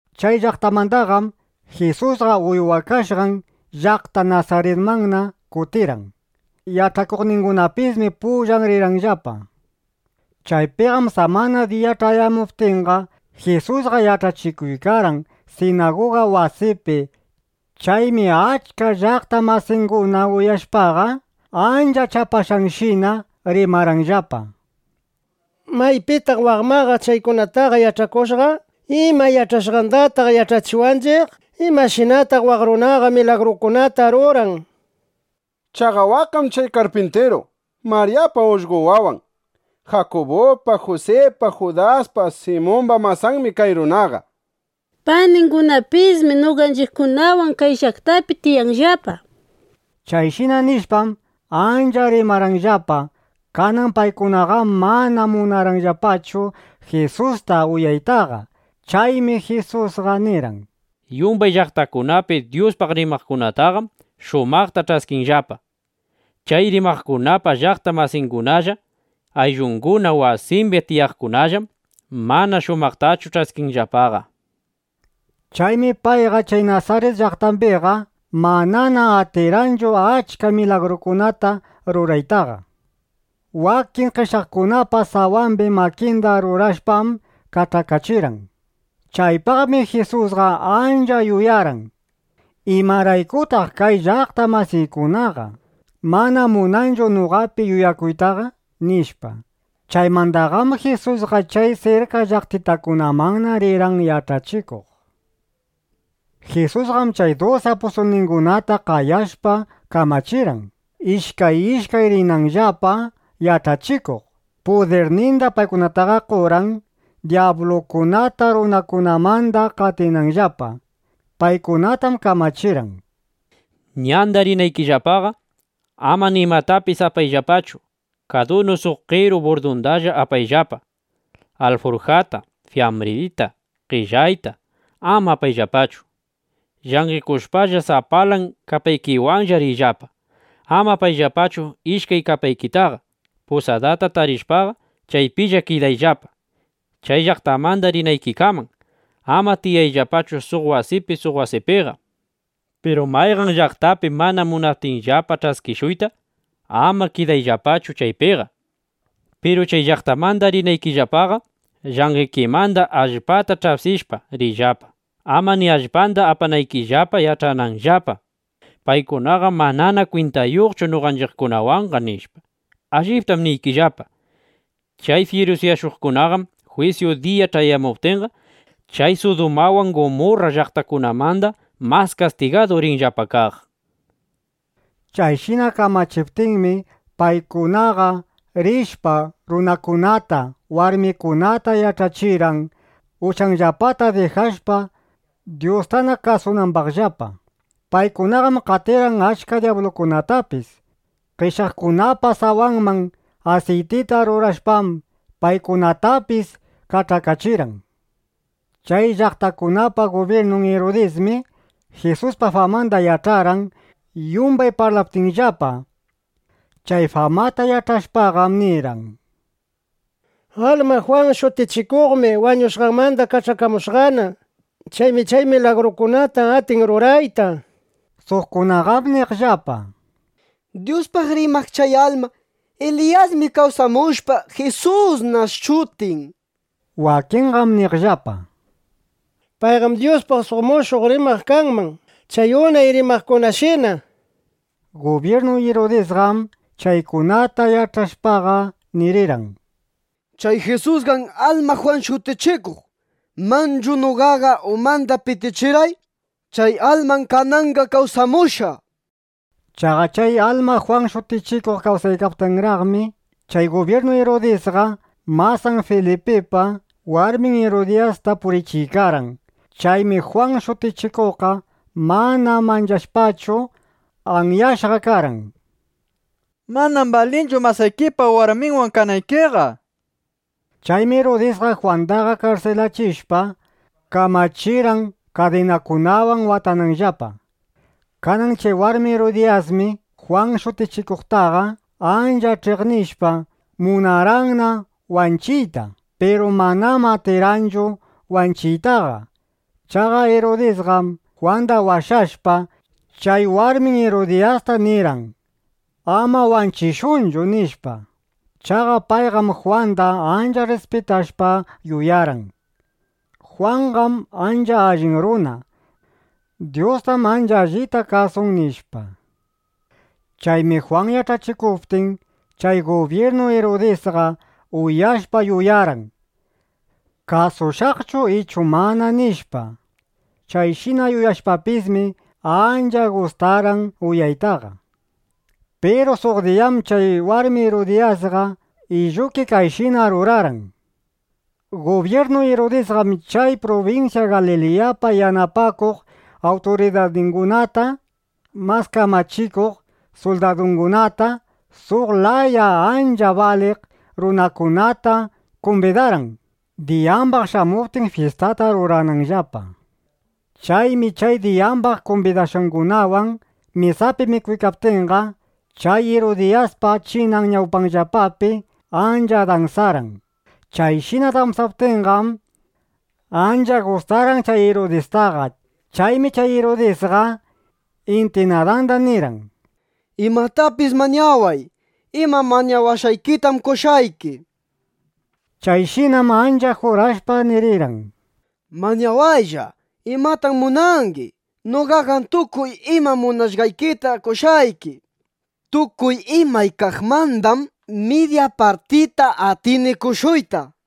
Chay llaqtamandaqam Jisusqa uywakashqan llaqta Nasaritmanna kutirqan. Yach'akuqningunapismi pullan rirqanllapa. Chaypiqam samana diya ch'ayamuptinqa, Jisusqa yach'achikuykarqan sinaguga wasipi. Chaymi achka llaqta masinguna uyashpaqa, ancha chapashqanshina rimarqanllapa: —¿Maypitaq waq imaqa chaykunataqa yach'akushqa? ¿Ima yach'ashqandataq yach'achiwanchiq? ¿Imashinataq waq runaqa milagrukunataqa ruran? Chaqa waqqam chay karpintiru. Maryapa ullqo wawan. Jakubupa, Jusipa, Judaspa, Simumba masanmi kay runaqa. Paningunapismi noqanchiqkunawan kay llaqtapi tiyanllapa. Chayshina nishpam, ancha rimarqanllapa. Kanan paykunaqam mana munarqanllapachu Jisusta uyaytaqa. Chaymi Jisusqa nirqan: —Yumbay llaqtakunapi Dyuspaq rimaqkunataqam shumaqta ch'askinllapa. Chay rimaqkunapa llaqta masingunalla, ayllunguna, wasimbi tiyaqkunallam mana shumaqtachu ch'askinllapaqa. Chaymi payqa chay Nasarit llaqtambiqa manana atirqanchu achka milagrukunata ruraytaqa. Wakin qeshyaqkunapa sawambi makinda rurashpam kach'akachirqan. Chaypaqmi Jisusqa ancha yuyarqan: ¿imaraykutaq kay llaqta masiykunaqa mana munanchu noqapi yuyakuytaqa? nishpa. ˻Chaymandaqam Jisusqa chay sirka llaqtitakunamanna rirqan yach'achikuq.˼ Jisusqam chay dusi apustulningunata qayashpa kamachirqan, ishkay ishkay rinanllapa yach'achikuq. Pudirninda paykunataqa qorqan, dyablukunata runakunamanda qatinanllapa. Paykunatam kamachirqan: —Ñanda rinaykillapaqa, ama nimatapis apayllapachu. Kadunu suq qeru burdundalla apayllapa. Alfurjata, fiyambrita, qellayta ama apayllapachu. Llanqekushpalla sapalan kapaykiwanlla riyllapa. Ama apayllapachu ishkay kapaykitaqa. Pusadata tarishpaqa, chaypilla kidayllapa, chay llaqtamanda rinaykikaman. Ama tiyayllapachu suq wasipi suq wasipiqa. Piru mayqan llaqtapi mana munaptinllapa ch'ayachishuyta, ama kidayllapachu chaypiqa. Piru chay llaqtamanda rinaykillapaqa llanqekimanda allpata ch'apsishpa riyllapa, ama ni allpanda apanaykillapa, yach'ananllapa: Paykunaqam manana kwintayuqchu noqanchiqkunawanqa, nishpa. Alliptam niykillapa, chay fyirusyashuqkunaqam jwisyu diya ch'ayamuptinqa, chay Sudumawan Gumurra llaqtakunamanda mas kastigadu rinllapa kaq, nishpa. Chayshina kamachiptinmi, paykunaqa rishpa, runakunata, warmikunata yach'achirqan, uchanllapata dijashpa, Dyustana kasunambaqllapa. Paykunaqam qatirqan achka dyablukunatapis. Qeshyaqkunapa sawanman asiytita rurashpam, paykunatapis kach'akachirqan. Chay llaqtakunapa gubyirnun Irudismi Jisuspa famanda yach'arqan, yumbay parlaptinllapa. Chay famata yach'ashpaqam nirqan: —Alma Jwan Shutichikuqmi wañushqanmanda kawsamushqana. Chaymi chay milagrukunata atin rurayta, nishpa. Suqkunaqam niqllapa: —Dyuspaq rimaq chay alma Eliyasmi kawsamushpa, Jisusna shutin, nishpa. Wakinqam niqllapa: —Payqam Dyuspaq suq mushuq rimaq kanman, chay unay rimaqkunashina, nishpa. Gubyirnu Irudisqam chaykunata yach'ashpaqa nirirqan: —Chay Jisusqam alma Jwan Shutichikuq. Manchu noqaqa umanda pitichirqay. Chay almam kananqa kawsamushqa, nishpa. Chaqa chay alma Jwan Shutichikuq kawsaykaptinraqmi, chay gubyirnu Irudisqa masan Filipipa warmin Irudiyasta purichiykarqan. Chaymi Jwan Shutichikuqqa mana manchashpachu, anyashqa karqan: —Manam balinchu masaykipa warminwan kanaykiqa, nishpa. Chaymi Irudisqa Jwandaqa karsilachishpa, kamachirqan kadinakunawan watananllapa. Kanan chay warmi Irudiyasmi Jwan Shutichikuqtaqa ancha ch'iqnishpa, munarqanna wanchiyta, piru manam atirqanchu wanchiytaqa. Chaqa Irudisqam Jwanda washashpa, chay warmin Irudiyasta nirqan: —Ama wanchishunchu, nishpa. Chaqa payqam Jwanda ancha rrispitashpa yuyarqan: Jwanqam ancha allin runa. Dyustam ancha allita kasun, nishpa. Chaymi Jwan yach'achikuptin, chay gubyirnu Irudisqa uyashpa yuyarqan: ¿Kasushaqchu ichu mana? nishpa. Chayshina yuyashpapismi, ancha gustarqan uyaytaqa. Piru suq diyam chay warmi Irudiyasqa illuki kayshina rurarqan. Gubyirnu Irudisqam chay prubinsya Galiliyapa yanapakuq awturidarningunata, mas kamachikuq suldadungunata, suq laya ancha baliq runakunata kumbidarqan, diyambaq shamuptin, fyistata rurananllapa. Chaymi chay diyambaq kumbidashqangunawan mesapi mikuykaptinqa, chay Irudiyaspa chinan ñawpanllapapi ancha dansarqan. Chayshina dansaptinqam, ancha gustarqan chay Irudistaqa. Chaymi chay Irudisqa intinadanda nirqan: —Imatapis mañaway. Ima mañawashqaykitam qoshqayki, nishpa. Chayshinam ancha jurashpa nirirqan: —Mañawaylla. ¿Imatam munangi? Noqaqam tukuy ima munashqaykita qoshqayki. Tukuy imay kaqmandam midya partita atini qoshuyta, nishpa.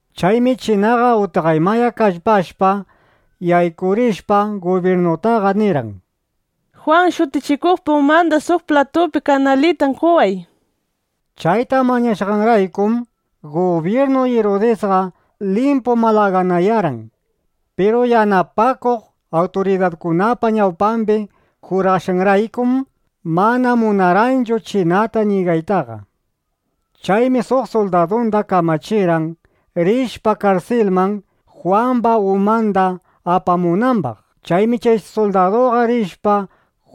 Chaymi chinaqa utqaymaya kallpashpa, yaykurishpa, gubyirnutaqa nirqan: —Jwan Shutichikuqpa umanda suq platupi kanalitan qoway, nishpa. Chayta mañashqanraykum, gubyirnu Irudisqa limpu malaganayarqan. Piru yanapakuq awturidarkunapa ñawpambi jurashqanraykum, mana munarqanchu chinata ñigaytaqa. Chaymi suq suldadunda kamachirqan, rishpa karsilman, Jwamba umanda apamunambaq. Chaymi chay suldaduqa rishpa,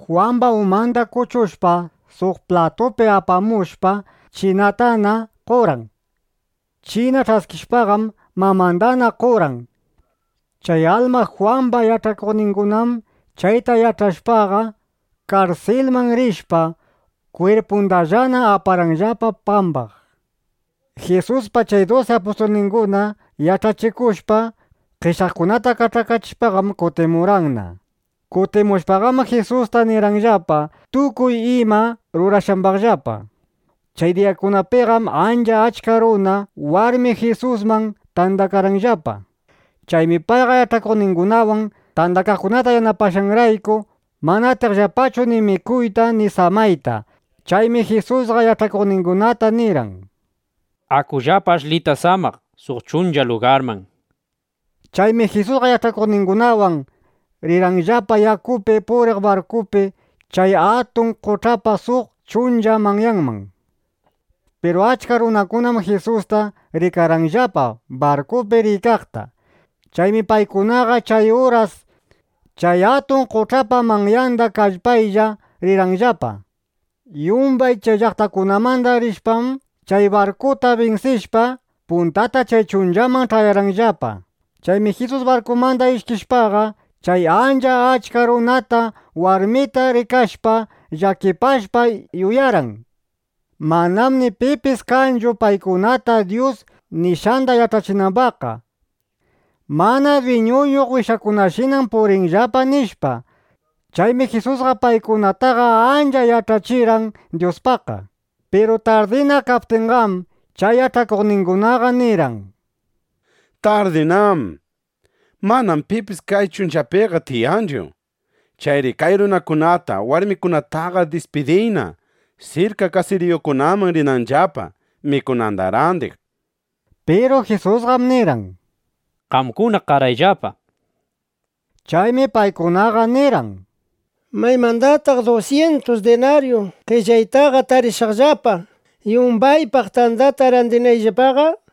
Jwamba umanda kuchushpa, suq platupi apamushpa, chinatana qorqan. China ch'askishpaqam mamandana qorqan. Chay alma Jwamba yach'akuqningunam chayta yach'ashpaqa, karsilman rishpa, kwirpundallana aparqanllapa pambaq. Jisuspa chay dusi apustulninguna yach'achikushpa, qeshyaqkunata kach'akachishpaqam kutimurqanna. Kutimushpaqam Jisusta nirqanllapa tukuy ima rurashqambaqllapa. Chay diyakunapiqam ancha achka runa, warmi Jisusman tandakaqllapa. Chaymi payqa yach'akuqningunawan tandakaqkunata yanapashqanrayku, mana atiqllapachu ni mikuyta ni samayta. Chaymi Jisusqa yach'akuqningunata nirqan: —Akullapa ashlita samaq suq chuncha lugarman, nishpa. Chaymi Jisusqa yach'akuqningunawan rirqanllapa yakupi puriq barkupi chay atun qoch'apa suq chuncha manyanman. Piru achka runakunam Jisusta rikarqanllapa barkupi riykaqta. Chaymi paykunaqa chay uras chay atun qoch'apa manyanda kallpaylla rirqanllapa. Yumbay chay llaqtakunamanda rishpam, chay barkuta binsishpa, puntata chay chunchamanna ch'ayarqanllapa. Chaymi Jisus barkumanda ishkishpaqa, chay ancha achka runata, warmita rikashpa, llakipashpa, yuyarqan: Manam ni pipis kanchu paykunata Dyus nishqanda yach'achinambaqqa. Mana dwiñuyuq wishakunashinam purinllapa, nishpa. Chaymi Jisusqa paykunataqa ancha yach'achirqan Dyuspaqqa. Piru tardina kaptinqam, chay yach'akuqningunaqa nirqan: —Tardinám. Manam pipis kay chunchapiqa tiyanchu. Chayri kay runakunata, warmikunataqa dispidiyna, sirka kasiriyukunaman rinanllapa, mikunanda randiq, nishpa. Piru Jisusqam nirqan: —Qamkuna qarayllapa, nishpa. Chaymi paykunaqa nirqan: —¿Maymandataq dusyintus dinaryu qellaytaqa tarishaqllapa, yumbaypaq tandata randinayllapaqa? nishpa.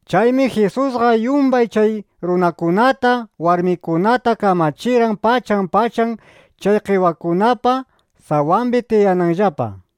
Chaymi Jisusqa yumbay chay runakunata, warmikunata kamachirqan, pachan pachan chay qewakunapa sawambi tiyanambaqllapa.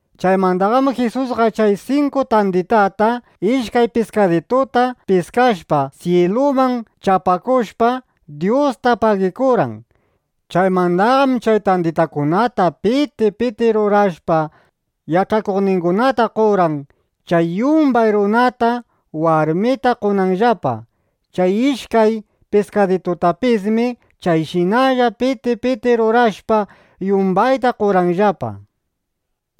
Chaymandaqam Jisusqa chay sinku tanditata, ishkay piskadituta piskashpa, syiluman chapakushpa, Dyusta pagikurqan. Chaymandaqam chay tanditakunata piti piti rurashpa, yach'akuqningunata qorqan, chay yumbay runata, warmita qonanllapa. Chay ishkay piskaditutapismi chayshinalla piti piti rurashpa, yumbayta qorqanllapa.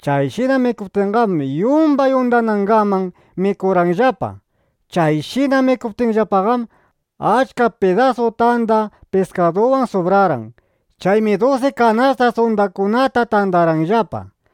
Chayshina qoptinqam, yumbay undanangaman mikurqanllapa. Chayshina mikuptinllapaqam, achka pidasu tanda piskaduwan subrarqan. Chaymi dusi kanasta undakunata tandarqanllapa.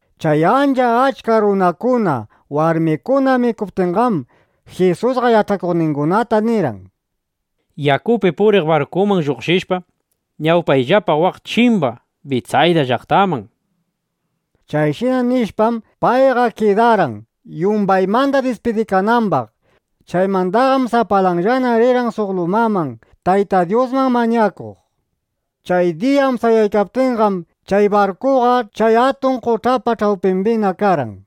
Chay ancha achka runakuna, warmikuna mikuptinqam, Jisusqa yach'akuqningunata nirqan: —Yakupi puriq barkuman lluqshishpa, ñawpayllapa waq chimba Bitsayda llaqtaman, nishpa. Chayshina nishpam, payqa kidarqan, yumbaymanda dispidikanambaq. Chaymandaqam, sapalanllana rirqan suq lumaman, Tayta Dyusman mañakuq. Chay diya amsayaptinqam, chay barkuqa chay atun qoch'apa ch'awpimbina karqan.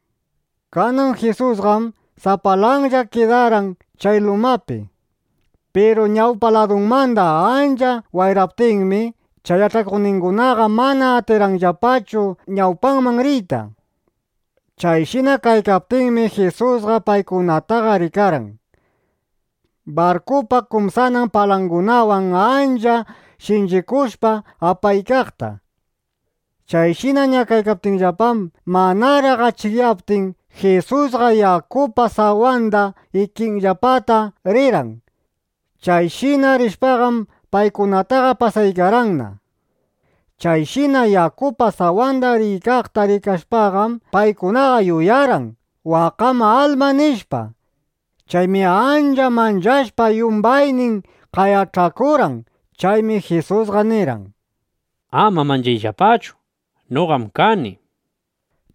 Kanan Jisusqam sapalanlla kidarqan chay lumapi. Piru ñawpa ladunmanda ancha wayraptinmi, chay yach'akuqningunaqa mana atirqanllapachu ñawpaman riyta. Chayshina kaykaptinmi, Jisusqa paykunataqa rikarqan barkupa kumsanan palangunawan ancha shinchikushpa apaykaqta. Chayshina ñakaykaptinllapam, manaraq achikyaptin, Jisusqa yakupa sawanda ikinllapata rirqan. Chayshina rishpaqam, paykunataqa pasaykarqanna. Chayshina yakupa sawanda riykaqta rikashpaqam, paykunaqa yuyarqan: ¡Waqqam alma! nishpa. Chaymi ancha manchashpa yumbaynin qayach'akurqan. Chaymi Jisusqa nirqan: —Ama manchayllapachu. Noqam kani, nishpa.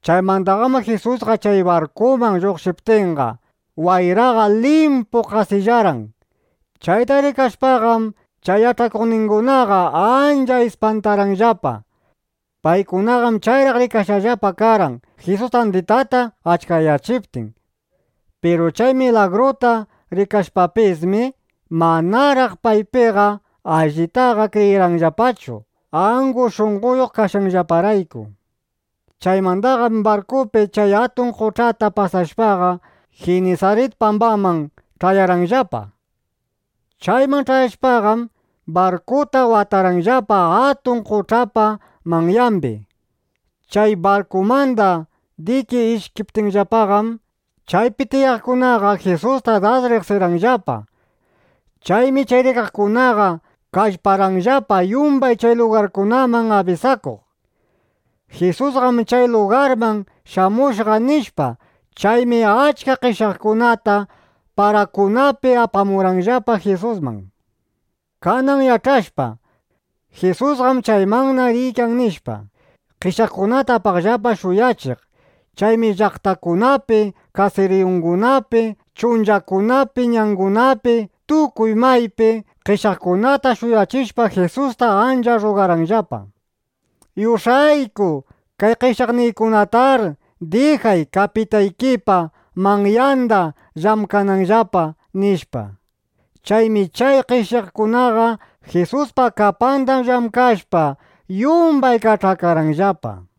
Chaymandaqam Jisusqa chay barkuman lluqshiptinqa, wayraqa limpu qasillarqan. Chayta rikashpaqam, chay yach'akuqningunaqa ancha ispantarqanllapa. Paykunaqam chayraq rikashqallapa karqan, Jisus tanditata achkayachiptin. Piru chay milagruta rikashpapismi, manaraq paypiqa allitaqa kriyirqanllapachu, angu shunqoyuq kashqanllaparayku. Chaymandaqam barkupi chay atun qoch'ata pasashpaqa, Jinisarit pambaman ch'ayarqanllapa. Chayman ch'ayashpaqam, barkuta watarqanllapa atun qoch'apa manyambi. Chay barkumanda diki ishkiptinllapaqam, chaypi tiyaqkunaqa Jisustaqa das riqsirqanllapa. Chaymi chay rikaqkunaqa kallparqanllapa yumbay chay lugarkunaman abisakuq: —Jisusqam chay lugarman shamushqa, nishpa. Chaymi achka qeshyaqkunata parakunapi apamurqanllapa Jisusman. Kanan yach'ashpa: Jisusqam chaymanna riykan, nishpa, qeshyaqkunata apaqllapa shuyachiq. Chaymi llaqtakunapi, kasiriyukunapi, chunchakunapi, ñangunapi, tukuy maypi qeshyaqkunata shuyachishpa, Jisusta ancha rrugarqanllapa: —Yush'ayku kay qeshyaqniykunatar dijay, kapitaykipa manyanda llamkananllapa, nishpa. Chaymi chay qeshyaqkunaqa Jisuspa kapanda llamkashpa, yumbay kach'akarqanllapa.